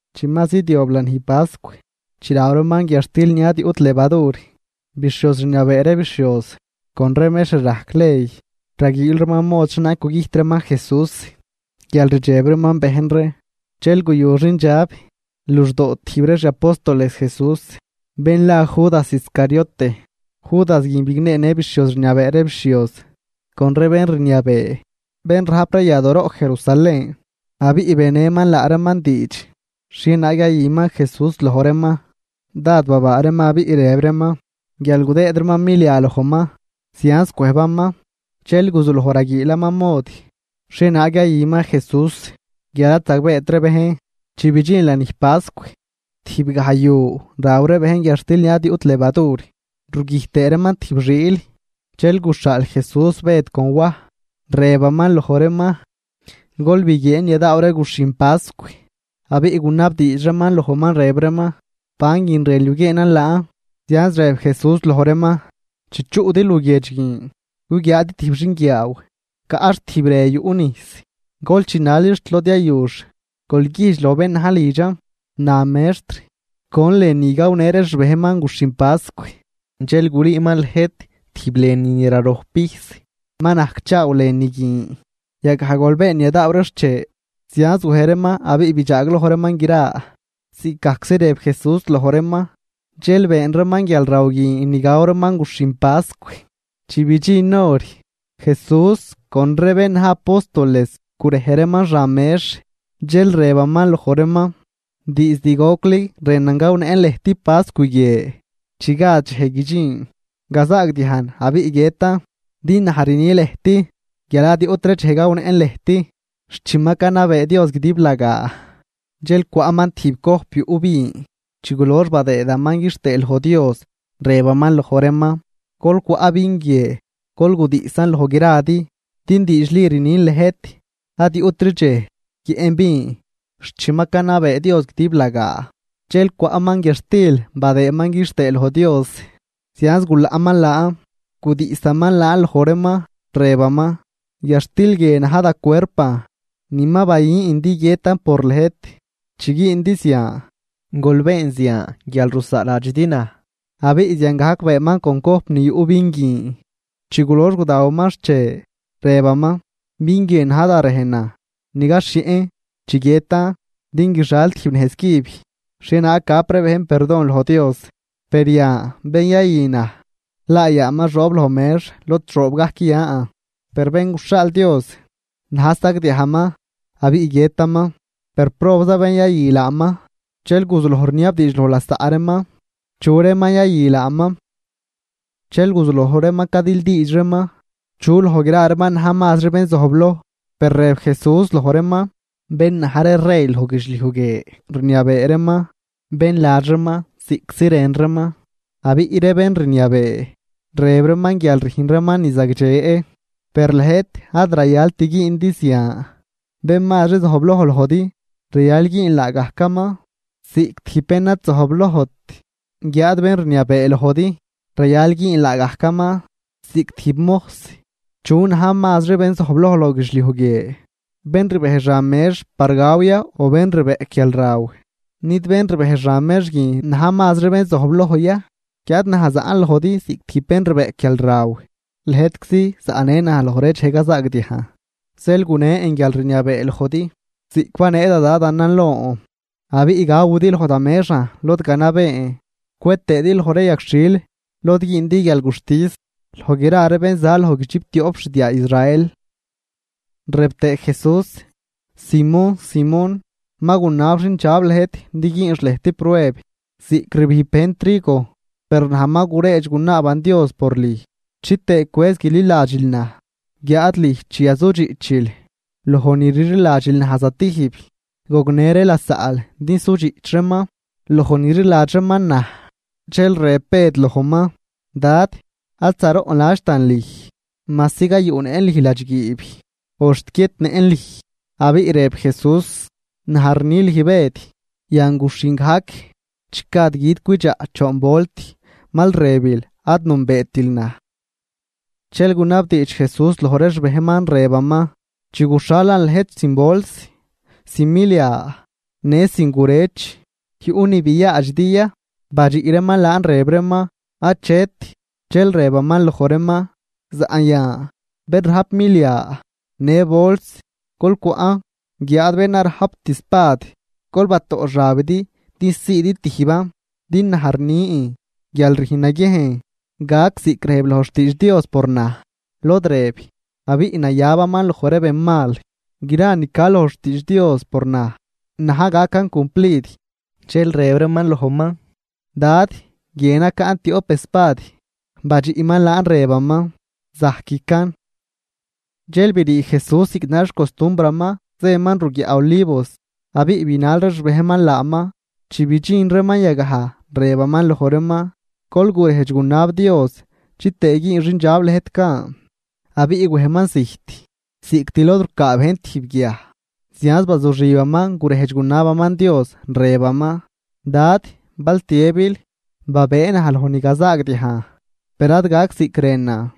Chi ma zidyob lanij pascw, chi raw reeman guiadxtil ni ad yuꞌt levadur. Bixhioz rniabee ree bixhioz con ree mextr rajc ley, raguiil reeman mod xhienaag gugüjt reeman Jesús guial rdxeb reeman bejn ree. Dxel guyu xindxab luxdoo tijb ree xi apóstoles Jesús, bén la Judas Iscariote. Judas guin bigneenë bixhioz rniabee ree bixhioz con ree bén rniabee bén rajp ree yadooroꞌ Jerusalén, abiꞌ benëman laa reeman diidx xhienaag yayüman Jesús loj reeman. Dád babaa reeman abiꞌ rëb reeman guial gudëëd reeman milia lojman. Zianz cwëjbaman, dxel guzuloj raguiilaman mod xhienaag yayüman Jesús, guial ad zagbeet ree bejn. Chi bidxin lanij pascw, tijbgaj yu raw ree bejn guiadxtil ni ad yuꞌt levadur rugüjt tëë reeman tijb xiil, dxel guxhaal Jesús Bëd con Waj, rëbaman loj reeman: ―Gol biguieen ni yadaaw ree guxhin pascw. Abiꞌ gunabdiidx reeman lojman rëb reeman: ―¿Ban guin rënl yuguieenan laan? Zianz rëb Jesús loj reeman: ―Chi chuꞌdi luguiedx guin, guguiaadi tijb xinguiaaw caꞌx tijb re yuꞌ nijs. Gol chinalix xt lod yayux, gol güjdx loj bén na̱j lidxan: “Na mextr: ¿Con lënü gawnë ree xbejnman guxhin pascw?” Dxel gulüüman lëjt tijb lënü ni rarojp pijs, ma najcchaaw lënü guin. Yagaj gol been ni yadaaw ree xche. Zianz wej reeman abiꞌ bidxaagloj reeman gra ziꞌcgajczi rëb Jesús loj reeman. Dxel been reeman guialraw guin ni gaw reeman guxhin pascw. Chi bidxin hor, Jesús con ree bén na̱j apóstoles gurej reeman xan mex. Dxel rëbaman loj reeman: ―¡Diizd gocli rënan gawnëꞌn lëjt pascw guie, chi gad dxej guidxin gazaagdiajn abiꞌ guiëtan! Din naj rni lëjt guial ad yuꞌtri dxej gawnëꞌn lëjt, xt chi ma canabee Dios guidiblagaa. Dxel cwaꞌman tijb cojp yuꞌ vin, chi gulox badëëman quixtëë loj Dios, rëbaman loj reeman: ―Gol cwaꞌ vin guie, gol gudiꞌsan loj gradi. Din diidxli rnin lëjt, ad yuꞌtri dxej guiëꞌn vin xt chi ma canabee Dios guidiblagaa. Dxel cwaꞌman guiadxtil badëëman quixtëë loj Dios, zianz gulaꞌman laan, gudiꞌsaman laan loj reeman, rëbgajman: ―Guiadxtil guie na̱j da cuerpan ni ma bayün din guiëtan por lëjt. Chi güündi zian, gol been zian guial rusaaladxidi naj. Abiꞌ ziangajc beenman con cojp ni yuꞌ vin guin, chi gulox gudawaman xche, rëbaman: ―Vin guie na̱j da rejnan ni gaxhieꞌn chi guiëtan din guixal tijb nejz cüb xhienaag gap ree bejn perdon loj Dios. ’Per yan bén yayü naj, laa yaaman xoob loj mex lod xoob gajc yan. Per Bén guxhaal Dios, na̱j sagdiajman abiꞌ guiëtaman. Per ¡probza bén yayü laaman! Dxel guzuloj rniabdiidx loj lasaꞌ reeman chu reeman yayü laaman. Dxel guzuloj reeman cadildiidx reeman chu loj gra reeman na̱j mazri bén zojbloj. Per rëb Jesús loj reeman: ―Bén na̱j ree rey loj guidxliuj guie rniabee reeman bén ladx reeman ziꞌctzi rën reeman, abiꞌ ree bén rniabee, rëb reeman guial rüjn reeman ni zagdxe. Per lëjt ad rayalt güündi zian, bén mazri zojbloj lojdi rayal güün laagajcaman ziꞌc tijb bén ad zojblojt. Guiáad bén rniabee lojdi rayal güün laagajcaman ziꞌc tijb mojs. ¿Chu na̱j mazri bén zojbloj loj guidxliuj guie? ¿Bén rbej xan mex par gaw ya o bén rbeꞌc guialraw? ¿Nid bén rbej xan mex guin na̱j mazri bén zojbloj ya? Guiáad naj zaꞌn lojdi ziꞌc tijb bén rbeꞌc guialraw. ’Lëjtczi zaꞌnë naj loj ree dxej cazaagdiajn. Zeel gunen guialrniabee lojdi ziꞌc banee da Dadanan lon, abiꞌ gawidi loj da mexan lod ganabeen cwe tëëdi loj ree yagxhil lod güündi guialguxtis loj gra ree bén za loj guidxiptioꞌp xdiaa Israel. Rëb tëë Jesús: ―Simón, Simón, ma gunab xindxab lëjt din güünx lëjt prueb ziꞌc rbijb bejn trigo. Per naj ma guredx gunaaban Dios por lüj chitëë cwëz chililadxil naj. Guiáad lüj chi yazudxiꞌchil loj ni rliladxil naj zatijb, gognë ree lasaꞌl din sudxiꞌch reeman loj ni rliladx reeman naj. Dxel rëb Bëd lojman: ―Dad, ad zaroꞌnladxtan lüj majsi gayuꞌnëꞌn lüj ladxguiib o xt guiëtnëꞌn lüj. Abiꞌ rëb Jesús: ―Naj rni lüj Bëd, yan guxhin gajc chi gad gui̱d cwidxaꞌ, choon volt mal rëbil ad nünbeetil naj. Dxel gunabdiidx Jesús loj ree xbejnman rëbaman: ―Chi guxhalan lëjt sin bols, sin milia, në sin gurëch, ¿yuꞌ ni biaadxidi ya? Badxiꞌ reeman laan rëb reeman: ―Achet. Dxel rëbaman loj reeman: ―Saꞌn yan bén rajp milia në bols, gol cwaꞌn. Guiáad bén ad rajpt espad, gol batoꞌ xabidi din siidi tijban. Din naj rni guial rüjn naguiejn gac ziꞌc rëb loj xtiidx Dios por naj, lod rëb: “Abiꞌ nayabaman loj ree benmal.” Gra ni ca loj xtiidx Dios por naj, na̱j gacan cumplid. Dxel rëb reeman lojman: ―Dad, guie nacaꞌn tioꞌp espad. Badxiꞌman laan rëbaman: ―Zajquican. Dxel brii Jesús ziꞌc na̱j xcostumbraman zëman ruguiaꞌ Olivos, abiꞌ binal ree xbejnman laaman. Chi bidxin reeman yagaj, rëbaman loj reeman: ―Gol gurejdx gunab Dios, chitëë güün xindxab lëjt gan. Abiꞌ wejman zijt ziꞌct lod rucaa bejn tijb guiaj, zianz bazuxibaman gurejdx gunabaman Dios, rëbaman: ―Dad, bal tiëbil, babëë naj loj ni gazaagdiajn per ad gac ziꞌc rënan,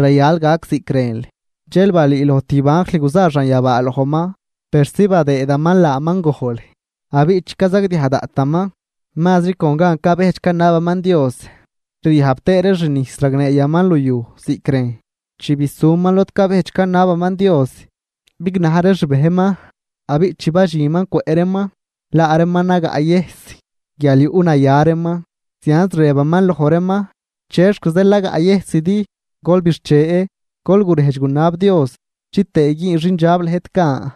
rayal gac ziꞌc rënl. Dxel balüüloj tijb anjl guza xanyabaa lojman persi badëëman laaman gojl. Abiꞌ chi cazagdiaj daꞌtaman, mazri con gan cabejdx canabaman Dios ryajb tëë ree xnijs ragneeyaman luyuj ziꞌc rejn. Chi bisuman lod cabejdx canabaman Dios, bignaj ree xbejnman abiꞌ chi badxinman cwëꞌ reeman laa reeman nagaꞌyëjs, guial yuꞌnaya reeman. Zianz rëbaman loj reeman: ―¿Chexc zeel nagaꞌyëjsidi? Gol bixche, gol gurejdx gunab Dios chitëë güün xindxab lëjt gan.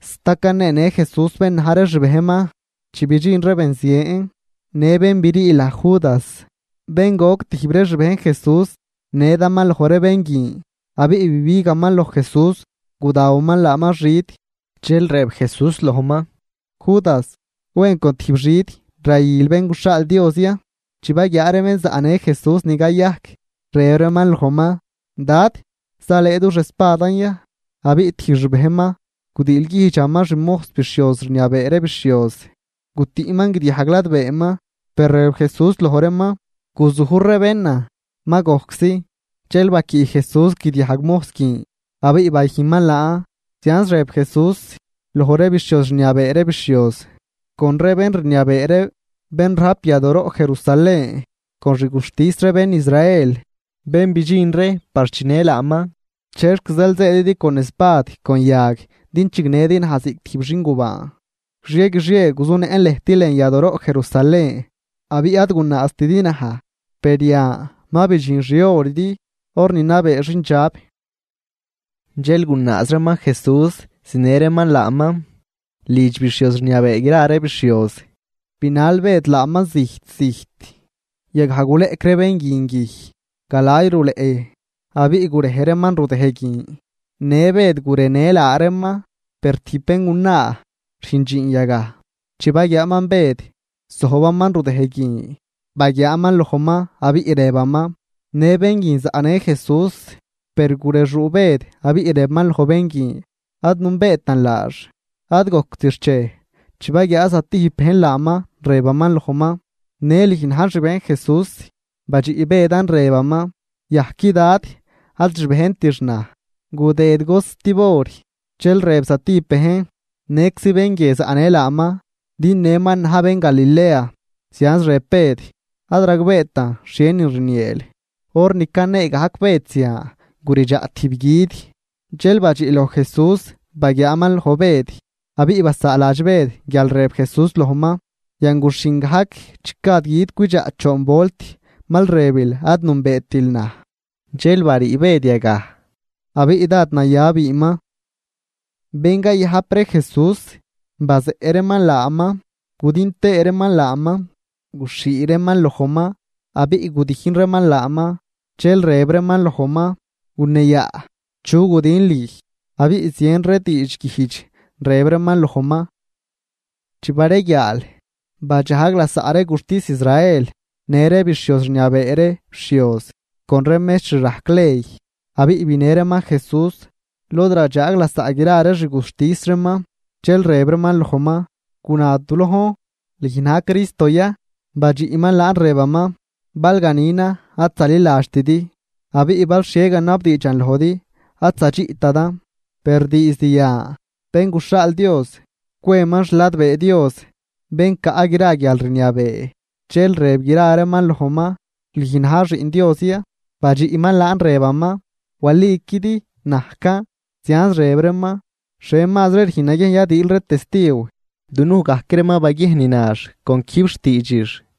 Sta caneenë Jesús bén na̱j ree xbejnman chi bidxin ree benzien. Në bén brii laj Judas, bén goc tijb ree xbejn Jesús, nedaman loj ree bén guin abiꞌ bibigaman loj Jesús gudawaman laaman xid. Dxel rëb Jesús lojman: ―Judas, ¿wen con tijb xid rayül Bén guxhaal Dios ya? Chi baguiaa ree bén zaꞌnë Jesús ni cayajc, rëb reeman lojman: ―Dad, ¿zalëë dux espadan ya? Abiꞌ tijb xbejnman gudiilguijdxaman xmojs bixhioz rniabee gra ree bixhioz, gutüꞌman guidiajg ladbeeman. Per rëb Jesús loj reeman: ―Guzujr ree bénan. Ma gojczi. Dxel baquiꞌ Jesús guidiajg mojs guin abiꞌ bayüjnman laan. Zianz rëb Jesús loj ree bixhioz rniabee ree bixhioz, con ree bén rniabee ree bén rajp yadooroꞌ Jerusalén con xguxtis ree bén Israel, bén bidxin ree par chinë laaman: ―¿Chexc zeel zëëdidi con espad con yag din chinëdi naj ziꞌc tijb xingubaan? Guixie guixie guzunëꞌn lëjt lën yadooroꞌ Jerusalén abiꞌ ad gunaaztidi naj. Per yan ma bidxin xihoridi, hor ni nabee xindxab. Dxel gunaaz reeman Jesús zinë reeman laaman lidx bixhioz rniabee gra ree bixhioz, binal Bëd laaman zijt zijt. Yagaj guleꞌc ree bén guin guij galay luleꞌ, abiꞌ gurej reeman rudëj guin. Në Bëd gurejnë laa reeman. Per tijb béngunaa rüjn dxiin yagaj, chi baguiaaman Bëd zojbaman rudëj guin, baguiaaman lojman, abiꞌ rëbaman: ―Në bén guin zaꞌnë Jesús. Per gurexuu Bëd, abiꞌ rëbaman loj bén guin: ―Ad nünbeetan laax. Ad gojct xchej chi baguiaa zatijb bejn laaman, rëbaman lojman: ―Në lüj na̱j xbejn Jesús. Badxiꞌ Bëdan rëbaman: ―Yajqui dad, ad xbejntix naj. Gudëd cost tib hor, dxel rëb zatijb bejn: ―Nëczi bén guie zaꞌnë laaman din nëman na̱j bén Galilea. Zianz rëb Bëd: ―Ad ragbeetan xhienin rnieel. Hor ni canee gajc Bëd zian guridxaꞌ tijb gui̱d. Dxel badxiꞌ loj Jesús baguiaaman loj Bëd, abiꞌ basaaladx Bëd guial rëb Jesús lojman: “Yan guxhin gajc chi gad gui̱d cwidxaꞌ, choon volt mal rëbil ad nünbeetil naj.” Dxel barii Bëd yagaj, abiꞌ dád naya biinman. Bén cayajp ree Jesús, bazeꞌ reeman laaman gudijn tëë reeman laaman. Guxhii reeman lojman abiꞌ gudijn reeman laaman, dxel rëb reeman lojman: ―¡Guneeyaꞌ chu gudin lüj! Abiꞌ zien ree diidxguijdx rëb reeman lojman. Chi bareguiaal, badxajg lasaꞌ ree guxtis Israel, në ree bixhioz rniabee ree bixhioz con ree mextr rajc ley, abiꞌ binë reeman Jesús lod radxaag lasaꞌ gra ree xguxtis reeman, dxel rëb reeman lojman: ―Guna du lojn, ¿lüj na̱j Cristo ya? Badxiꞌman laan rëbaman: ―Bal ganinan ad zaliladxtidi. Abiꞌ bal xhie ganabdiidxan lojdi, ad zadxiꞌtidan. Per diizd yan, Bén guxhaal Dios cweman xladbee Dios, bén caꞌ gra guialrniabee. Dxel rëb gra reeman lojman: ―¿Lüjn na̱j Xiꞌn Dios ya? Badxiꞌman laan, rëbaman: ―Waliquidi najcan. Zianz rëb reeman: ―¿Xhie mazri rüjn naguiejn yadiil ree testiw? Dunuj gajc ree ma baguiejn ni nax con quijb xtiidxix.